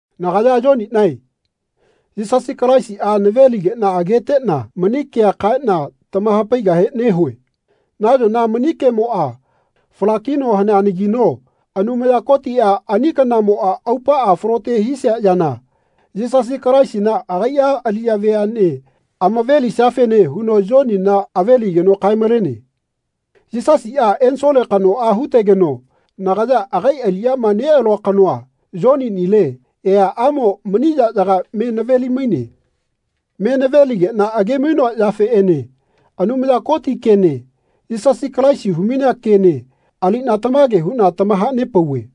Nagaya Yoniꞌnae Yisasi Kalaisiꞌa naveligeꞌna ageteꞌna mani kea kaeꞌna tamahapaigahe nehue. Nayona mani kemoꞌa fala-kino haneanagino Anumaya Kotiꞌa ani kanamoꞌa aupaꞌa falote hisia yana Yisasi Kalaisina agaiꞌa aliꞌya veaꞌne amave-lisiafene huno Yonina ave-ligeno kae-malene. Yisasiꞌa ensole kanoꞌa hutegeno nagaya agai aliꞌyama neꞌalua kanoa, Yoninile, eaꞌamo mani yaꞌyaga me naveli-maine. Me naveligeꞌna age-mainoa yafeꞌene Anumaya Koti kene Yisasi Kalaisi humainea kene aliꞌna tamage huꞌna tamahanepauve.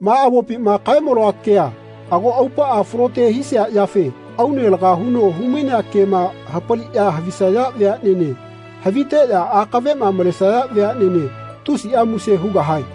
Ma avopima kae-maloa kea ago aupaꞌa falote hisia yafe aune laga huno humainea kema hapaliꞌya havisaya veaꞌnene haviteꞌya akaveꞌma malesaya veaꞌnene tusiꞌa muse hugahae.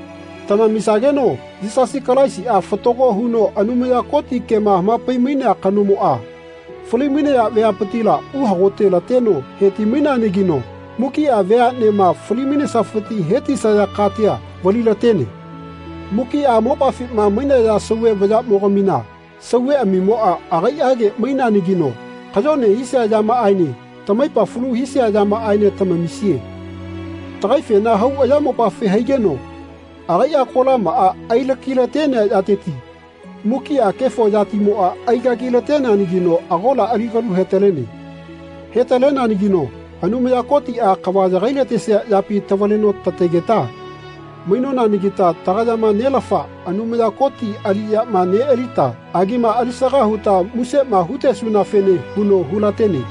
Tamamisageno Yisasi Kalaisiꞌa fatago huno Anumaya Koti kema hamapai-mainea kanomoꞌa fali-mainaya veapitila uhagote-lateno heti-maineanagino mukiꞌa veaꞌnema fali-mainesafiti hetisaya katia valilatene. Mukiꞌa mopafima mainaya sauve vayaꞌmogamina sauveꞌamimoꞌa agaiꞌage maineanagino kayone hisia yamaꞌaene tamaipamo falu hisia yamaꞌaene tamamisie. Tagaifena hau ayamopafi haigeno agaiꞌa kolamaꞌa ailaki-talenea yateti mukiꞌa kefo yatimoꞌa aigagilateneanagino agola ali kalu hetalene. He-taleneanagino Anumaya Kotiꞌa kava yagailatesia yapi tavaleno tategeta mainonanagita tagayama Nelafa Anumaya Koti aliꞌyama neꞌalita agima alisaga huta musema hutesunafene huno hulatene.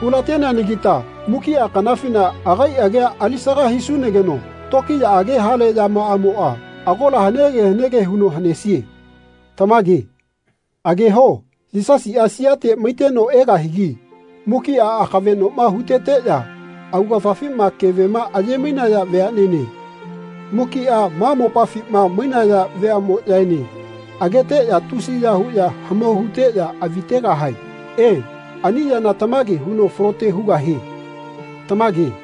Hulateneanagita mukiꞌa kanafina agai agia alisaga hisunageno tokiyaꞌage hale yamaꞌamoꞌa agola hanege hanege huno hanesie. Tamage. Ageho Yisasiꞌa siate maiteno egahigi mukiꞌa amakaveꞌnoma huteteꞌya augafafima kevema aye-mainaya veaꞌnene mukiꞌa ma mopafima mainaya veaꞌmoꞌyaene ageteꞌya tusiya huꞌya hamau huteꞌya avi tegahae. E, ani yana tamage huno falote hugahie. Tamage.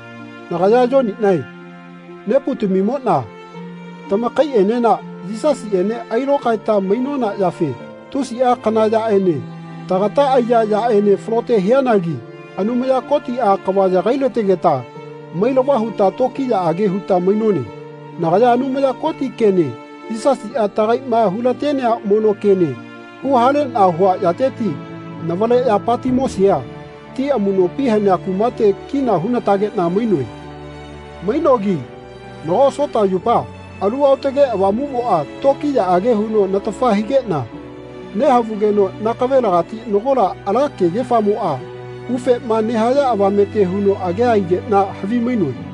Nagaya Yoniꞌnae neputamimoꞌna tamakaiꞌenena Yisasiꞌene ailokaeta mainona yafe tusiꞌa kana yaꞌene tagata aiya yaꞌene falote hianagi Anumaya Kotiꞌa kava yagailategeta mailava huta tokiyaꞌage huta mainone. Nagaya Anumaya Koti kene Yisasiꞌa tagaiꞌma hulatenea mono kene huhaleꞌna hua yateti navaleꞌya Patimosia ti amuꞌnopi hanea kumate kina hunatageꞌna mainoe. Mainogi nago Sotaꞌyupa Alu Aotage Avamuꞌmoꞌa tokiyaꞌage huno natafa higeꞌna nehavugeno nakavelagati nagola ala kegefamoꞌa ufema nehaya avamete huno agea aigeꞌna havimainoe.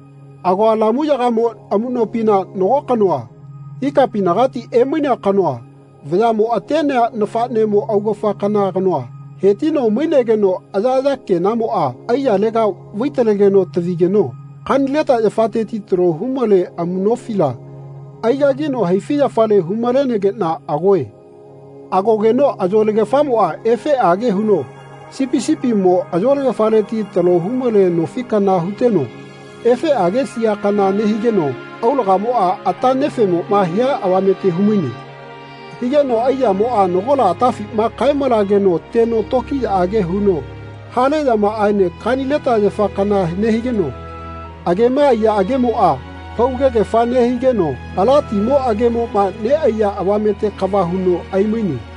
Agoa lamuyagamo amuꞌnopina nago kanoa, ikapinagati emainea kanoa vayaꞌmo atenea nafaꞌnemo augafa kana kanoa hetino mainegeno ayaꞌaya kenamoꞌa aiyalega vai-talegeno tavigeno kanileta yafateti talo humale amuꞌnofila aigagino haifiꞌyafale hu-malenegeꞌna agoe. Agogeno ayolagefamoꞌa efeꞌage huno sipi sipimo ayolagefaleti talo humale nofi kana huteno efeꞌage sia kana nehigeno aulagamoꞌa ata nefemoꞌma hia avamete humaine. Higeno aiyamoꞌa nagola atafima kae-malageno teno tokiyaꞌage huno hale yamaꞌaene kanileta yafa kana nehigeno agema aiya agemoꞌa paugegefa nehigeno ala timo agemoꞌma neꞌaiya avamete kava huno aimaine.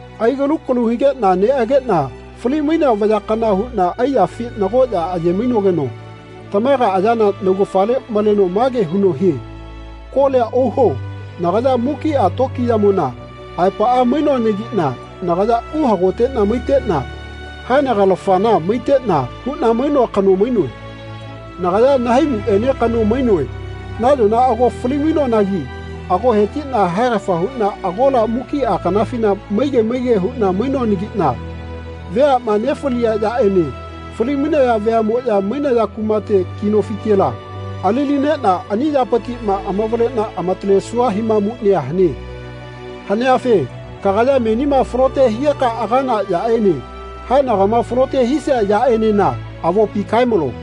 Aigalu galu higeꞌna neꞌageꞌna fali-mainea vaya kana huꞌna aiyafi nagoꞌya aye-mainogeno tamaga ayana naugafale maleno mage huno hie “Kolia ohuo nagaya mukiꞌa tokiyamona aepaꞌa mainoanagiꞌna nagaya uhagoteꞌna maiteꞌna haenagalafana maiteꞌna huꞌna mainoa kano mainoe. Nagaya nahaimuꞌene kano mainoe. Nayona ago fali-mainoanagi ago hetiꞌna haegafa huꞌna agola mukiꞌa kanafina maige maige huꞌna mainoanagiꞌna veaꞌma nefalia yaꞌene fali-mainaya veaꞌmoꞌya mainaya kumate ki nofitela ali-lineꞌna ani yapitiꞌma amavaleꞌna amatalesua himamuꞌnia hane. Haneafe kagaya menima falote higeka agana yaꞌene haenagama falote hisia yaꞌenena avopi kae-malo.